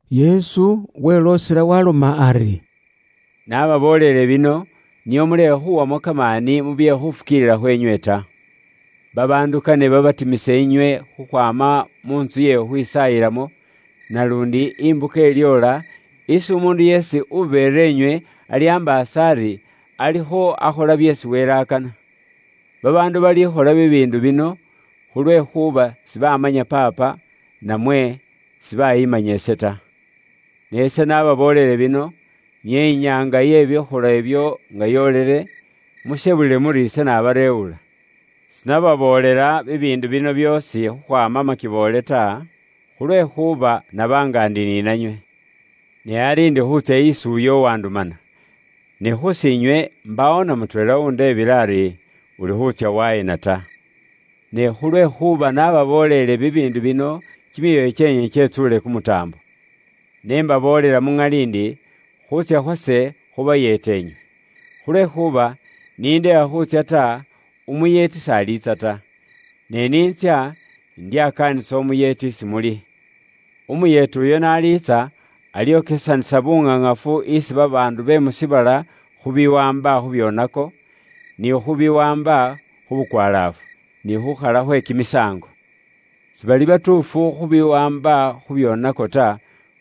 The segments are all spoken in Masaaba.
Yesu weloosela waaloma ari, “Naababooleele bino nio mulekhe khuwamo kamaani mu bye khufukiilila khweenywe ta. Babaandu kane babekalewo inywe khukhwaama mu ntsu iye khukhwisaayilamo, naluundi imbuka ilyoola isi umuundu yeesi ubeera inywe alyambaasa ari alikho akhola byeesi Wele akana. Babaandu balikhola bibiindu bino khulwekhuuba sibaamanya Paapa, namwe sibayiimanya ise ta. Ne ise nababooleele bino, nio inyaanga iye bikholwa ibyo nga yoolile, mushebulile muri ise nabareewula. Buuraambi bw'Omwoyo Umukhosefu “Sinababoolela bibiindu bino byoosi khukhwaama makiboole ta, khulwekhuuba naba nga ndi ni nanywe. Ne ari ndi khuutsya isi uyo uwandumana. Ne khus'inywe mbaawo namutweela uwundeebile ari, ‘Ulikho wutsya waheena’ ta. Ne khulwekhuuba naababooleele bibiindu bino, kimyoyo kyeenywe kyetsuule kumutaambo. Ne mbaboolela mu ŋali ndi, khuutsya khwase khubayeeta nywe. Khulwekhuuba ise ni ndekha khuutsya ta, Umuyeeti s'aliitsa ta. Ne ise n'intsya, indyakaanisa Umuyeeti isi muli. Umuyeeti uyo n'aliitsa, alyokesanisa buŋaŋafu isi babaandu be mu shiibala khu biwaamba khu byoonako, ni khubiwaamba khu bukwalaafu, ni khukhala khwe kimisaango. Sibali batuufu khu biwaamba khu byoonako ta,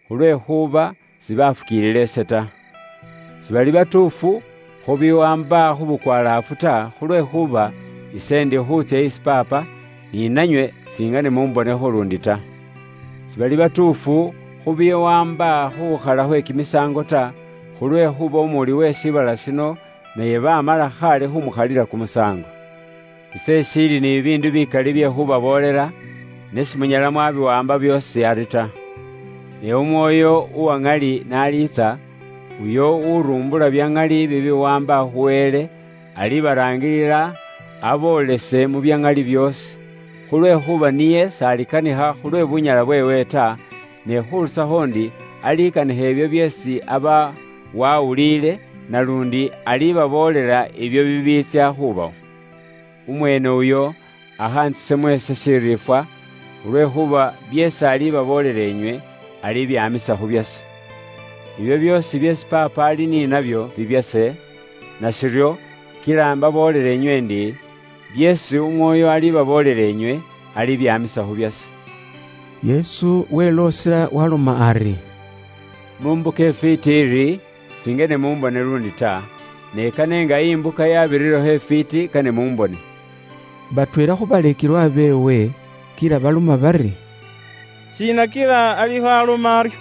khulwekhuuba sibaafukiilila ise ta. Sibali batuufu khu biwaamba khu bukwalaafu ta, khulwekhuuba ise ndi khuutsya isi Paapa, ni nanywe singane mumbonekho luundi ta. Sibali batuufu khu biwaamba khu khukhala khwe kimisaango ta, khulwekhuuba umuwuli uwe shiibala shino, naye baamala khaale khumukhalila kumusaango. “Ise ishiili ni bibiindu bikali bye khuubaboolela, ne simunyala mwabiwaamba byoosi ari ta. Ne Umwoyo uwa ŋali n'aliitsa, uyo urumbula bya ŋali bibiwaamba khu Wele, alibaraangilila inywe aboolese mu bya ŋali byoosi. Khulwekhuuba niye s'alikanikha khulwe bunyala bubweewe ta, ne khurusakho ndi alikanikha ibyo byeesi aba wawuliile, naluundi alibaboolela ibyo bibiitsya khubawo. Umweene uyo akhantsisemo ise shiriifwa, khulwekhuuba byeesi alibaboolela inywe, alibyaamisa khu byase. Ibyo byoosi byeesi Paapa ali ni nabyo, bibyase. Nashiryo kila imbaboolela inywe ndi, byeesi Umwoyo alibaboolela inywe, alibyaamisa khu byase.” Yesu weloosela waaloma ari, “Mu mbuka ifwiiti iri, singene mumbone luundi ta; ne kane nga imbuka yabirirekho ifwiiti, kane mumbone.” Batweela khu baleekelwa beewe kila baloma bari, “Shiina kila alikho aloma aryo?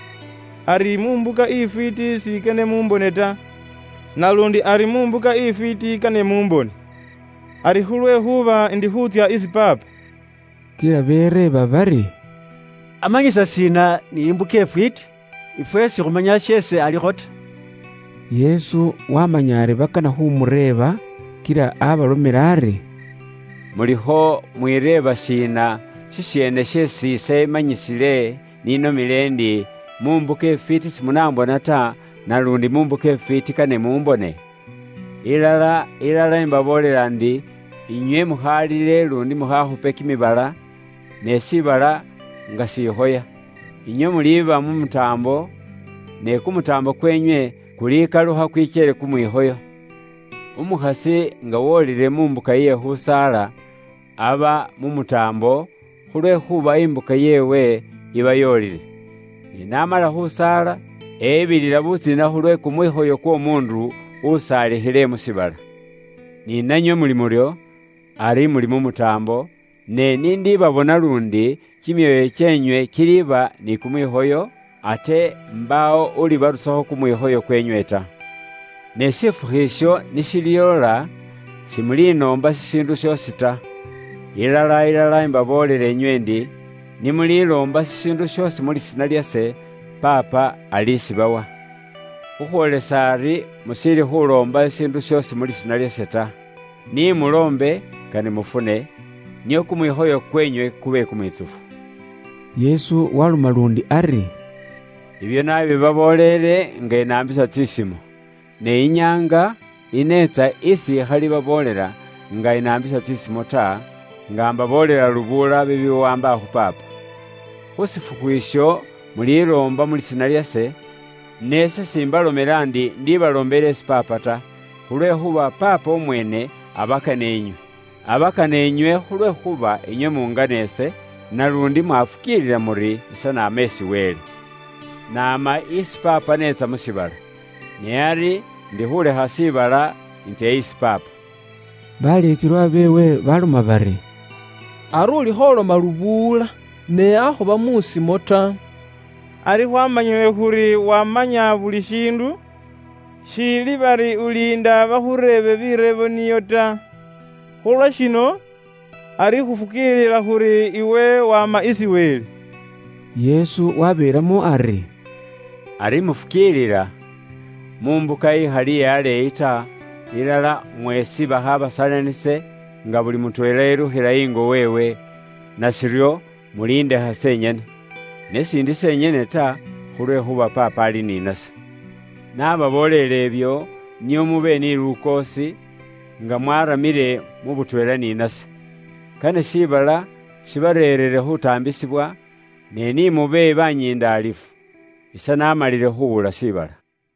Ari mu mbuka ifwiiti singene mumbone ta; naluundi ari mu mbuka ifwiiti kane mumbone? Ari khulwekhuuba ndi khuutsya isi Paapa?” Kila bereeba bari, “Amanyisa shiina ni imbuka ifwiiti? Ifwe sikhumanya sheesi alikho ta.” Yesu washimanya ari bakana khumureeba, kila abalomela ari, “Mulikho mwireeba shiina shisheene sheesi ise imanyisile ninomile ndi, ‘Mu mbuka ifwiiti simunaambona ta, naluundi mu mbuka ifwiiti, kane mumbone?’ Ilala, ilala, imbaboolela ndi inywe mukhalile luundi mukhaakhupe kimibala, ne shiibala nga shikhoya. Inywe muliba mu mutaambo, ne kumutaambo kwenywe kulikalukha kwikyele kumwikhoyo. Umukhasi nga wolile mu mbuka iye khusaala, aba mu mutaambo, khulwekhuuba imbuka yeewe iba yoolile. Ne n'amala khusaala, ebilila butsiina khulwe kumwikhoyo kw'omuundu usaalikhile mu shiibala. Ni nanywe muli muryo; ari muli mu mutaambo, ne ise n'indibabona inywe luundi, kimyoyo kyeenywe kiliba ni kumwikhoyo, ate mbaawo ulibarusakho kumwikhoyo kwenywe ta. “Ne shifukhu isho ni shilyoola, simulinoomba shishiindu shoosi ta. Ilala, ilala, imbaboolela nywe ndi, ni muliloomba shishiindu shoosi mu lisiina lyase, Paapa alishibawa. Khukhwoolisa ari mushiili khuloomba shishiindu shoosi mu lisiina lyase ta. Ni muloombe, kane mufune, nio kumwikhoyo kwenywe kube kumwitsufu.” Yesu waaloma luundi ari, “Ibyo naabibabooleele nga inaambisa tsisimo. Ne inyaanga ineetsa isi ikhalibaboolela nga inaambisa tsisimo ta; nga mbaboolela lubuula bibiwaamba khu Paapa. Khu shifukhu isho muliloomba mu lisiina lyase, ne ise s'imbalomela ndi ise ikhabaloombele inywe isi Paapa ta. Khulwekhuuba Paapa umweene abakana inywe. Abakana inywe khulwekhuuba inywe mungana ise, naluundi mwafukiilila muri ise naama isi Wele. Naama isi Paapa neetsa mu shiibala. Ne ari indikhuulekha shiibala intsya isi Paapa.” Baleekelwa beewe baaloma bari, “Ari ulikho uloma lubuula, ne akhuba mu simo ta. Ari khwaamanyile khuri wamanya buli shiindu, shiili bari uliinda bakhureebe bireebo nio ta. Khulwa shino, ari khufukiilila khuri iwe waama isi Wele.” Yesu waabeelamo ari, “Ari mufukiilila? Mu mbuka ikhali iye aleeyi ta, ilala mweesi bakhaabasalanise, nga buli mutweela elukhila ingo weewe, nashiryo muliindekha senyene. Ne s'indi senyene ta, khulwekhuuba Paapa ali ni nase. Nababoolele ibyo, nio mube ni lukoosi, nga mwaramile mu butweela ni nase. Kane shiibala shibareerere khutaambisibwa, ne ni mube banyindaalifu. Ise naamalile khuwula shiibala.”